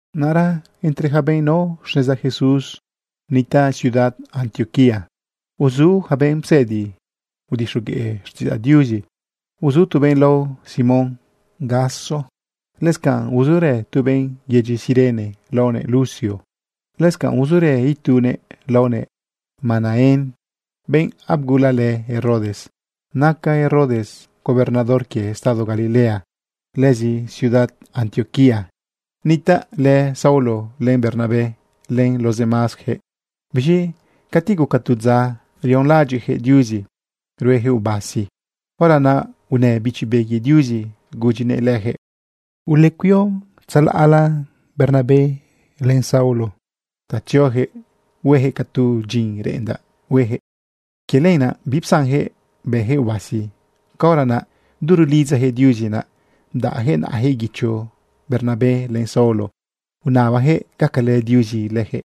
Naꞌra entre ja benꞌ nao xneza Jesús nitaꞌ ciudad Antioquía, uzu yaca benꞌ psëdi udixogueꞌ xtiꞌidzaꞌ Diuzi. Uzu tu benꞌ lao Simón Gaso. Lëscanꞌ uzurë tu benꞌ yedyi Cirene laonëꞌ Lucio. Lëscanꞌ uzurë itunëꞌ laonëꞌ Manaén, benꞌ abgulalë Herodes. Naca Herodes gobernador quie estado Galilea. Lëzi ciudad Antioquía nitaꞌlë Saulo len Bernabé len los demásyaquëꞌ. Biz̃i cati guca tu dza rionlaꞌadyiꞌyaquëꞌ Diuzi rueyaquëꞌ ubasi, hora naꞌ unë Bichi Be quie Diuzi gudyinëꞌ lejëꞌ: ―Uleudaꞌ Bernabé len Saulo ta tzioyaquëꞌ hueyaquëꞌ ca tu dyin reꞌendaꞌ hueyaquëꞌ. Quie lenaꞌ bipsanjëꞌ bëyaquëꞌ ubasi. Caora naꞌ du rulidzayaquëꞌ Diuzi, naꞌ bdaꞌyaquëꞌ naꞌajëꞌ guicho Bernabé len Saulo unabayaquëꞌ gacalë Diuzi leyaquëꞌ.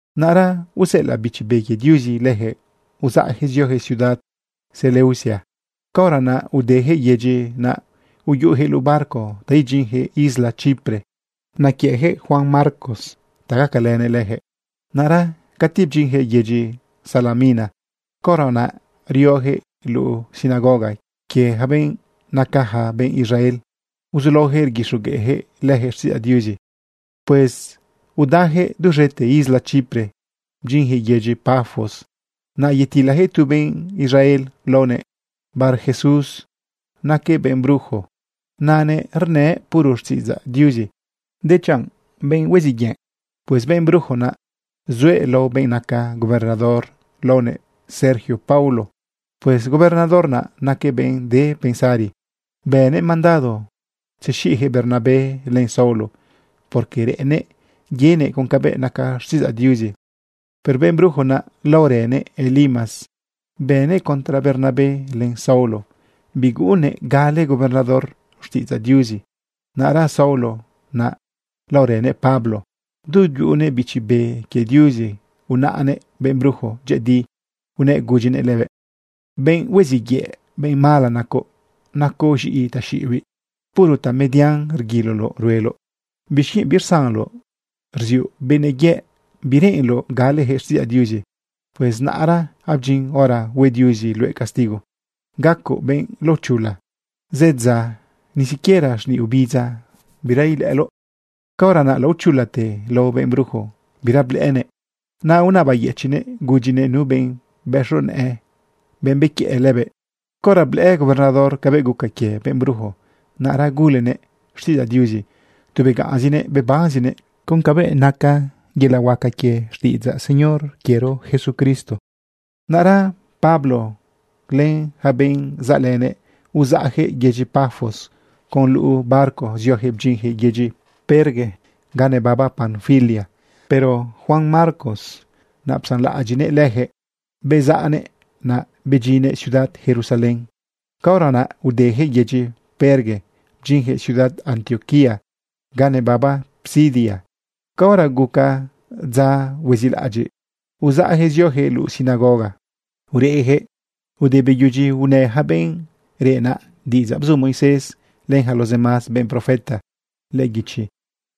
Naꞌra useꞌelaꞌ Bichi Be quie Diuzi leyaquëꞌ uzaꞌyaquëꞌ zioyaquëꞌ ciudad Seleucia. Caora naꞌ udejëꞌ yedyi naꞌ uyuꞌuyaquëꞌ luꞌu barco ta idyinyaquëꞌ isla Chipre. Naquiëꞌjëꞌ Juan Marcos ta gacalënëꞌ leyaquëꞌ. Naꞌra cati bdyinyaquëꞌ yedyi Salamina. Caora naꞌ rioyaquëꞌ luꞌu sinagoga quie ja benꞌ nacaja benꞌ Israel, uzulaoyaquëꞌ rguixogueꞌjëꞌ leyaquëꞌ xtiꞌidzaꞌ Diuzi. Pues udayaquëꞌ duz̃ete isla Chipre bdyinyaquëꞌ yedyi Pafos. Naꞌ yatilayaquëꞌ tu benꞌ Israel laonëꞌ Barjesús. Naquëꞌ benꞌ brujo, nanëꞌ rnëꞌ puro xtiꞌidzaꞌ Diuzi, dechanꞌ benꞌ hueziꞌ yëꞌ. Pues benꞌ brujo naꞌ zuëꞌ lao benꞌ naca gobernador laonëꞌ Sergio Paulo. Pues gobernador naꞌ naquëꞌ benꞌ de pensari. Bënëꞌ mandado tzexiꞌyaquëꞌ Bernabé len Saulo, porque reꞌennëꞌ yenëꞌ con cabëꞌ naca xtiꞌidzaꞌ Diuzi. Pero benꞌ brujo naꞌ laorënëꞌ Elimas, bënëꞌ contra Bernabé len Saulo. Biguꞌunnëꞌ gale gobernador xtiꞌidzaꞌ Diuzi. Naꞌra Saulo naꞌ laorënëꞌ Pablo, du yuꞌunëꞌ Bichi Be quie Diuzi, unaꞌnëꞌ benꞌ brujo dyëꞌëdi, unëꞌ gudyinëꞌ lëbëꞌ: ―Benꞌ hueziꞌ yëꞌ, benꞌ mala nacoꞌ. Nacoꞌ z̃iꞌi taxiꞌibiꞌ. Puro tamedian rguiloloꞌ rueloꞌ. ¿Bixquienꞌ birsanloꞌ rziuꞌ benëꞌ yëꞌ bireꞌenloꞌ galeyaquëꞌ xtiꞌidzaꞌ Diuzi? Pues naꞌra abdyin hora hue Diuzi luëꞌ castigo. Gacoꞌ benꞌ laochula. Zëdza ni siquiera xniꞌ obidza bira ilëꞌëloꞌ. Caora naꞌ laochulate lao benꞌ brujo, bira blëꞌënëꞌ. Naꞌ unabayëchiꞌnëꞌ gudyinëꞌ nu benꞌ bëxo nëꞌë, benꞌ bequiëꞌ lëbëꞌ. Caora blëꞌë gobernador cabëꞌ guca quie benꞌ brujo, naꞌra gulenëꞌ xtiꞌidzaꞌ Diuzi. Tu begaꞌnzinëꞌ bebanzinëꞌ con cabëꞌ naca yelaꞌ huaca quie xtiꞌidzaꞌ Señor quiero Jesucristo. Naꞌra Pablo lënëꞌ yaca benꞌ zaꞌlënëꞌ, uzaꞌyaquëꞌ yedyi Pafos con luꞌu barco zioyaquëꞌ bdyinyaquëꞌ yedyi Perge ga nebaba Panfilia. Pero Juan Marcos naꞌ psanlaꞌadyiꞌnëꞌ leyaquëꞌ bezaꞌnëꞌ naꞌ, bedyinnëꞌ ciudad Jerusalén. Caora naꞌ udeyaquëꞌ yedyi Perge bdyinyaquëꞌ ciudad Antioquía ga nebaba Pisidia. Caora guca dza huezilaꞌadyiꞌ, uzaꞌyaquëꞌ zioyaquëꞌ luꞌu sinagoga ureꞌyaquëꞌ. Ude beyudyi unë yaca benꞌ reꞌ naꞌ diꞌidzaꞌ bzu Moisés len yaca los demás benꞌ profeta lëꞌë guichi,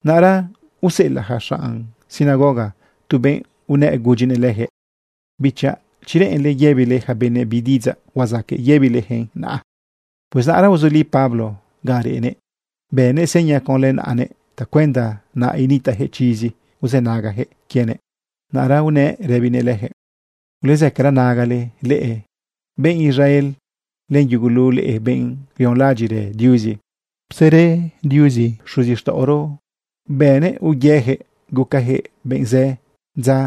naꞌra useꞌelaꞌ yaca xanꞌ sinagoga tu benꞌ unë gudyinëꞌ leyaquëꞌ: ―Bichaꞌ, chi reꞌenle yëbile ja benëꞌ bi diꞌidzaꞌ, huazaqueꞌ yëbilejëꞌn naꞌa. Pues naꞌra uzuli Pablo ga reꞌnëꞌ, bënëꞌ seña conlë naꞌanëꞌ tacuenda naꞌ initaꞌjëꞌ chizi uzënagayaquëꞌ quienëꞌ. Naꞌra unëꞌ rëbinëꞌ leyaquëꞌ: ―Ulezëcara nagale leꞌe benꞌ Israel len yugulu leꞌe benꞌ rionlaꞌadyiꞌrë Diuzi. Psere Diuzi xuzixtaꞌoro bënëꞌ uyeyaquëꞌ gucayaquëꞌ benꞌ zë dza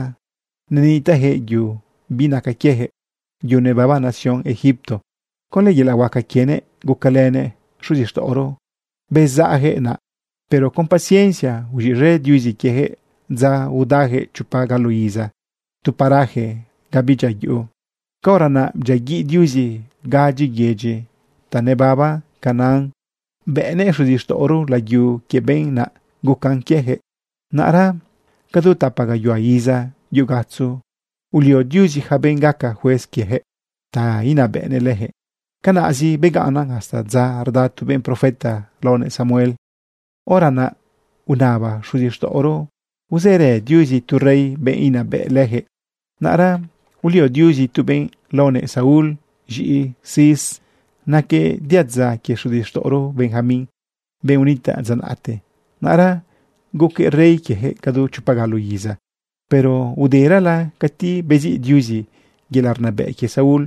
nenitaꞌjëꞌ yu binaca quieyaquëꞌ, yu nebaba nación Egipto. Conlë yelaꞌ huaca quienëꞌ gucalënëꞌ xuzixtaꞌoro bezaꞌyaquëꞌ naꞌ. Pero con paciencia uz̃iꞌz̃e Diuzi quieyaquëꞌ dza udayaquëꞌ chopa galo iza tu paraje ga bidyia yuꞌu. Caora naꞌ bdyiaguiꞌ Diuzi gadyi yedyi ta nebaba Canaán, bëꞌnëꞌ xuzixtaꞌoro layu quie benꞌ naꞌ gucan quieyaquëꞌ. Naꞌra cadu tapa gayuhua iza yu gatzo ulio Diuzi yaca benꞌ gaca juez quieyaquëꞌ ta inabëꞌnëꞌ leyaquëꞌ. Canaꞌzi begaꞌnnan hasta dza rda tu benꞌ profeta laonëꞌ Samuel. Hora naꞌ unaba xuzixtaꞌoro usere Diuzi tu rey, benꞌ inabëꞌ leyaquëꞌ. Naꞌra ulio Diuzi tu benꞌ laonëꞌ Saúl, z̃iꞌi Cis. Naquëꞌ diadza quie xuzixtaꞌoro Benjamín, benꞌ unitaꞌ dza naꞌte. Naꞌra guquëꞌ rey quieyaquëꞌ cadu chopa galo iza. Pero uderala cati beziꞌ Diuzi yelaꞌ rnabëꞌ quie Saúl,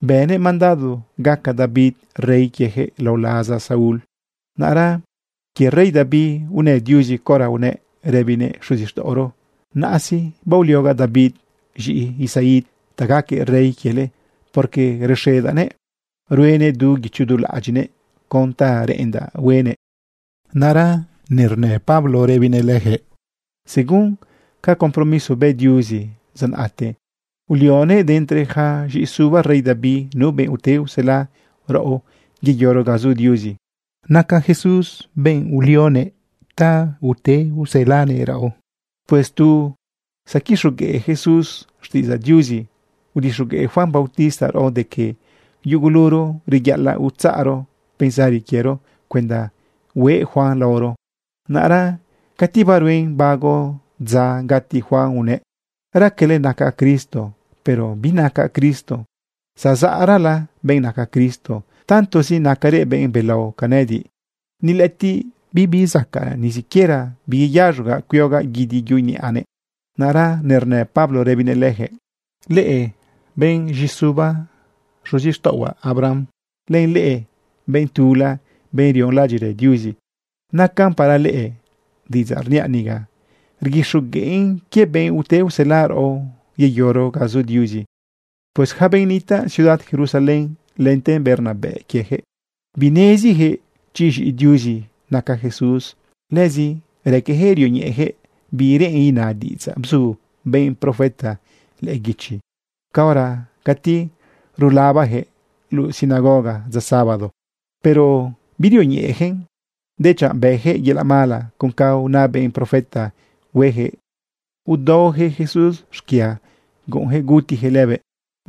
bënëꞌ mandado gaca David rey quieyaquëꞌ lao laza Saúl. Naꞌra quie rey David unë Diuzi caora unëꞌ rëbinëꞌ xuzixtaꞌoro: “Naꞌa sí, baoliogaꞌ David z̃iꞌi Isaí ta gaquëꞌ rey quiele, porque rexedaꞌnëꞌ ruenëꞌ du guicho du laꞌadyiꞌnëꞌ con ta reꞌendaꞌ huenëꞌ.” Naꞌra nernë Pablo rëbinëꞌ leyaquëꞌ: ―Según ca compromiso bë Diuzi dza naꞌte, ulionëꞌ de entre yaca z̃iꞌisuba rey David nu benꞌ ute usela raꞌo yeyoro ga zu Diuzi. Naca Jesús lëbenꞌ ulionëꞌ ta ute uselanëꞌ raꞌo. Pues tu zaquixogueꞌ Jesús xtiꞌidzaꞌ Diuzi, udixogueꞌ Juan bautista raꞌo de que yuguluro reyaꞌalaꞌ utzaꞌro pensari quiero cuenda hueꞌ Juan laoro. Naꞌra cati baruen bago dza gati Juan unëꞌ: “Raquele nacaꞌ Cristo, pero binacaꞌ Cristo. Zazaꞌrala benꞌ naca Cristo. Tantozi nacarëꞌ benꞌ belao ca nëꞌëdiꞌ, ni lëꞌëtiꞌ bibizacaꞌ ni siquiera biyeyaz̃ogaꞌ cuiogaꞌ guidi yuꞌu niꞌanëꞌ.” Naꞌra nernë Pablo rëbinëꞌ lejëꞌ: ―Leꞌe benꞌ z̃iꞌisuba xuzixtaꞌohuaꞌ Abraham, len leꞌe benꞌ tula, benꞌ rionlaꞌadyiꞌrë Diuzi, nacan para leꞌe diꞌidzaꞌ rniaꞌ niga. Rguixogueꞌn quie benꞌ ute usela raꞌo yeyoro ga zu Diuzi. Pues ja benꞌ nitaꞌ ciudad Jerusalén lente benꞌ rnabëꞌ quieyaquëꞌ, binezijëꞌ chi z̃iꞌi Diuzi naca Jesús. Lëzi raqueyaquëꞌ rioñeꞌeyaquëꞌ bi reꞌen ina diꞌidzaꞌ bzu benꞌ profeta lëꞌë guichi caora cati rulabajëꞌ luꞌu sinagoga dza sábado. Pero birioñeꞌeyaquëꞌn, dechanꞌ bëyaquëꞌ yelaꞌ mala con ca una benꞌ profeta hueyaquëꞌ udaoyaquëꞌ Jesús xquia guꞌunyaquëꞌ gutiyaquëꞌ lëbëꞌ.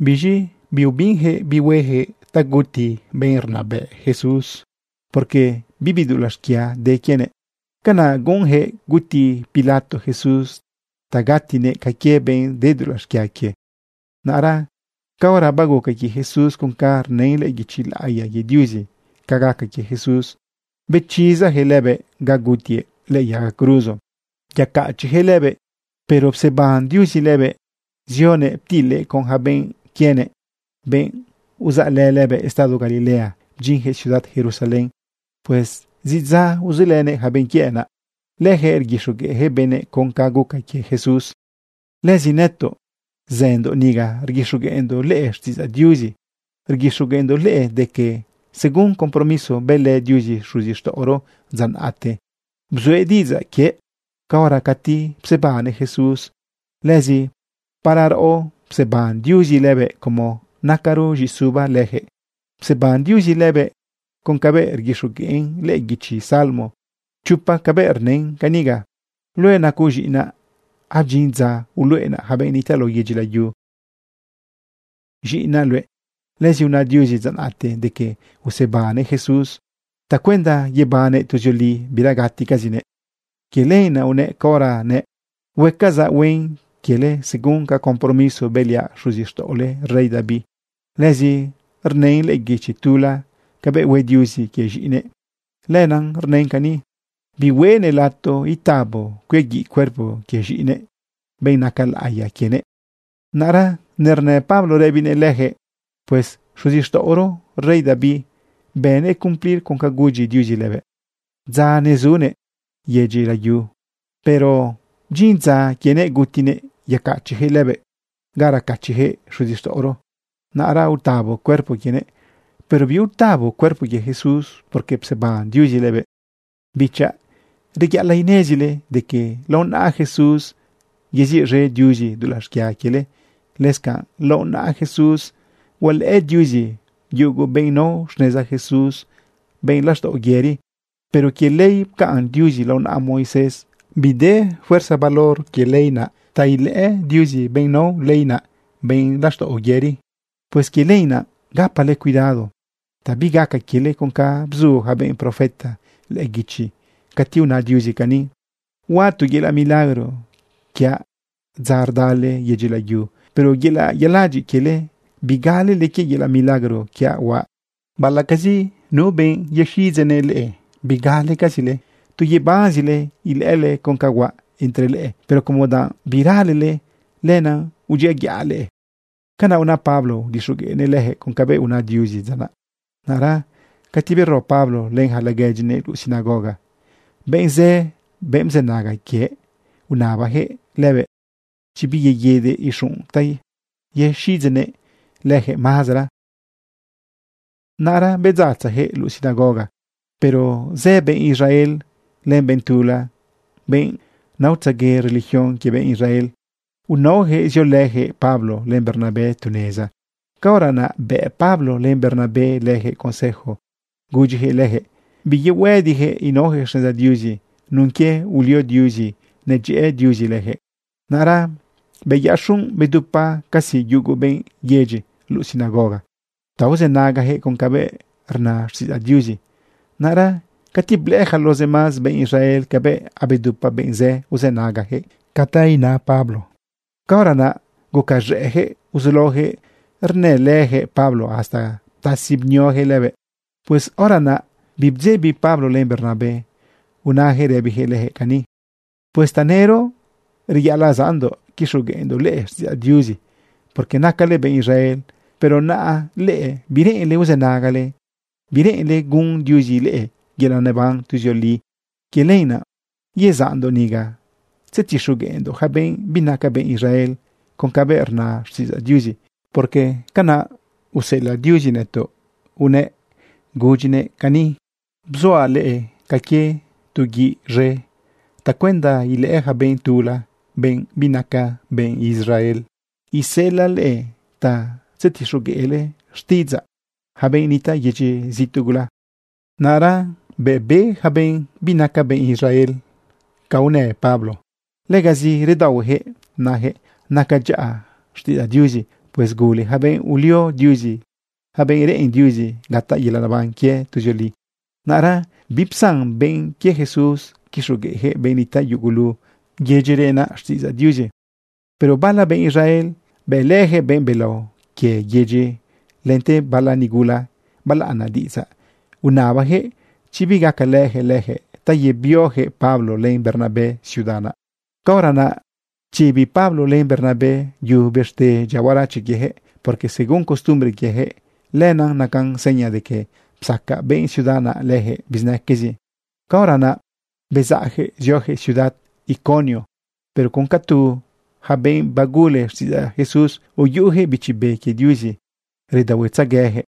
Biz̃i biubinyaquëꞌ bi hueyaquëꞌ ta guti benꞌ rnabëꞌ Jesús, porque bibi dulaꞌ xquia de quienëꞌ. Canaꞌ guꞌunjëꞌ guti Pilato Jesús ta gatinëꞌ ca quie benꞌ de dulaꞌ xquia quie. Naꞌra caora baguca quie Jesús con ca rna lëꞌë guichi laꞌiya quie Diuzi ca gaca quie Jesús, bechizayaquëꞌ lëbëꞌ ga gutiëꞌ lëꞌë yaga cruzo yecachiꞌyaquëꞌ lëbëꞌ. Pero pseban Diuzi lëbëꞌ zionëꞌ ptilëꞌ con yaca benꞌ quienëꞌ, benꞌ uzaꞌlë lëbëꞌ estado Galilea bdyinyaquëꞌ ciudad Jerusalén. Pues zidza uzulënëꞌ yaca benꞌ quiëꞌ naꞌ. Leyaquëꞌ rguixogueꞌjëꞌ benëꞌ con ca guca quie Jesús. ’Lëzi nëtoꞌ zëndoꞌ niga rguixogueꞌndoꞌ leꞌe xtiꞌidzaꞌ Diuzi, rguixogueꞌndoꞌ leꞌe de que según compromiso bëlë Diuzi xuzixtaꞌoro dza naꞌte, bzuëꞌ diꞌidzaꞌ quiëꞌ caora cati psebannëꞌ Jesús. Lëzi para raꞌo pseban Diuzi lëbëꞌ, como nacaro z̃iꞌisuba leyaquëꞌ. Pseban Diuzi lëbëꞌ con cabëꞌ rguixogueꞌn lëꞌë guichi salmo chopa cabëꞌ rnën caniga: “Luëꞌ nacoꞌ z̃iꞌinaꞌ. Abdyin dza uluꞌenaꞌ yaca benꞌ nitaꞌ lao yedyi layu z̃iꞌinaꞌ luëꞌ.” Lëzi una Diuzi dza naꞌte de que usebannëꞌ Jesús tacuenda yebannëꞌ tuzioli bira gaticazinëꞌ. Quie lenaꞌ unëꞌ caora nëꞌ: “Huecazaꞌ huen quiele según ca compromiso bëliaꞌ xuzixtaꞌole rey David.” Lëzi rnën lëꞌë guichi tula cabëꞌ hue Diuzi quie z̃iꞌinëꞌ. Lenaꞌ rnën cani: “Bihueꞌnëꞌ lato itabo cuiaguiꞌ cuerpo quie z̃iꞌinëꞌ, benꞌ naca laꞌiya quienëꞌ.” Naꞌra nernë Pablo rëbinëꞌ leyaquëꞌ: ―Pues xuzixtaꞌoro rey David, bënëꞌ cumplir con ca gudyi Diuzi lëbëꞌ dza nezunëꞌ yedyi layu. Pero bdyin dza quienëꞌ gutinëꞌ yecachiꞌyaquëꞌ lëbëꞌ ga racachiꞌyaquëꞌ xuzixtaꞌoro. Naꞌra utabo cuerpo quienëꞌ, pero biutabo cuerpo quie Jesús, porque pseban Diuzi lëbëꞌ. Bichaꞌ, reyaꞌalaꞌ inezile de que lao naꞌa Jesús yeziꞌz̃e Diuzi dulaꞌ xquia quiele. Lëscanꞌ lao naꞌa Jesús hualëꞌë Diuzi yugu benꞌ nao xneza Jesús benꞌ laxtaꞌo yëri. Pero quie ley pcaꞌn Diuzi lao naꞌa Moisés, bide fuerza valor quie ley naꞌ ta ilëꞌë Diuzi benꞌ nao ley naꞌ benꞌ laxtaꞌo yëri. Pues quie lenaꞌ gapale cuidado ta bigaca quiele con ca bzu ja benꞌ profeta lëꞌë guichi cati una Diuzi cani: Huaꞌ tu yelaꞌ milagro quiaꞌ dza rdale yedyi layu, pero yelaꞌ yaladyiꞌ quiele, bigalele quie yelaꞌ milagro quiaꞌ huaꞌ. Baꞌalaꞌcazi nu benꞌ yexiꞌidzeꞌnëꞌ leꞌe, bigalecazile. Tu yebanzile ilëꞌële con ca huaꞌ entre leꞌe, pero como danꞌ biralele, lenaꞌ udyiaguiꞌa leꞌe. Canaꞌ una Pablo udixogueꞌnëꞌ leyaquëꞌ con cabëꞌ una Diuzi dza naꞌ. Naꞌra cati bero Pablo len yaca laguedyinëꞌ luꞌu sinagoga, benꞌ zë, benꞌ bzënaga quiëꞌ, unabajëꞌ lëbëꞌ chi biyeguidëꞌ ixunꞌ ta yexiꞌidzeꞌnëꞌ leyaquëꞌ mazera. Naꞌra bedzatzayaquëꞌ luꞌu sinagoga, pero zë benꞌ Israel len benꞌ tula, benꞌ naotzegue religión quie benꞌ Israel, unaoyaquëꞌ ziolëyaquëꞌ Pablo len Bernabé tu neza. Caora naꞌ bëꞌ Pablo len Bernabé leyaquëꞌ consejo gudyiyaquëꞌ leyaquëꞌ biyuhuëdiyaquëꞌ inaoyaquëꞌ xneza Diuzi nun quie ulio Diuzi nedyëꞌë Diuzi leyaquëꞌ. Naꞌra beyaꞌ xunꞌ bedupa casi yugu benꞌ yedyi luꞌu sinagoga ta uzënagayaquëꞌ con cabëꞌ rna xtiꞌidzaꞌ Diuzi. Naꞌra cati blëꞌë yaca los demás benꞌ Israel cabëꞌ abedupa benꞌ zë uzënagayaquëꞌ ca una Pablo, caora naꞌ gucaz̃ëꞌyaquëꞌ uzulaoyaquëꞌ rnëlëyaquëꞌ Pablo hasta ptasi bnioyaquëꞌ lëbëꞌ. Pues hora naꞌ bibdzebi Pablo len Bernabé unayaquëꞌ rëbiyaquëꞌ leyaquëꞌ cani: ―Pues tanëro reyaꞌalaꞌ zaꞌndoꞌ quixogueꞌndoꞌ leꞌe xtiꞌidzaꞌ Diuzi porque nacale benꞌ Israel. Pero naꞌ leꞌe bireꞌenle uzënagale. Bireꞌenle gun Diuzi leꞌe yelaꞌ neban tuzioli. Quie lenaꞌ yezaꞌndoꞌ niga tzetixogueꞌndoꞌ yaca benꞌ binaca benꞌ Israel con cabëꞌ rna xtiꞌidzaꞌ Diuzi. Porque canaꞌ useꞌelaꞌ Diuzi nëtoꞌ unëꞌ gudyinëꞌ cani: Bzuaꞌ leꞌe ca quie tu guiꞌ z̃e tacuenda ilëꞌë yaca benꞌ tula, benꞌ binaca benꞌ Israel. Iseꞌelaꞌ leꞌe ta tzetixogueꞌle xtiꞌidzaꞌ yaca benꞌ nitaꞌ yedyi zituꞌ gula. Naꞌra bëꞌ be yaca benꞌ binaca benꞌ Israel ca unë Pablo, legazi redaohueyaquëꞌ nayaquëꞌ naca dyaꞌa xtiꞌidzaꞌ Diuzi. Pues gule yaca benꞌ ulio Diuzi, yaca benꞌ reꞌen Diuzi gataꞌ yelaꞌ neban quie tuzioli. Naꞌra bipsan benꞌ quie Jesús quixogueꞌyaquëꞌ benꞌ nitaꞌ yugulu yedyi reꞌ naꞌ xtiꞌidzaꞌ Diuzi. Pero bala benꞌ Israel bëꞌlëyaquëꞌ benꞌ belao quie yedyi, lente bala nigula balaꞌana diꞌidzaꞌ. Unabayaquëꞌ chi bigacalëyaquëꞌ leyaquëꞌ ta yebioyaquëꞌ Pablo len Bernabé ciudad naꞌ. Caora naꞌ pchibi Pablo len Bernabé yu bëxte dyia huarache quieyaquëꞌ, porque según costumbre quieyaquëꞌ, lenaꞌ nacan seña de que psaca benꞌ ciudad naꞌ leyaquëꞌ bizinaquezi. Caora naꞌ bezaꞌjëꞌ ziojëꞌ ciudad Iconio. Pero con ca tu yaca benꞌ bagule xtiꞌidzaꞌ Jesús, uyuꞌuyaquëꞌ Bichi Be quie Diuzi redaohuetzegueyaquëꞌ.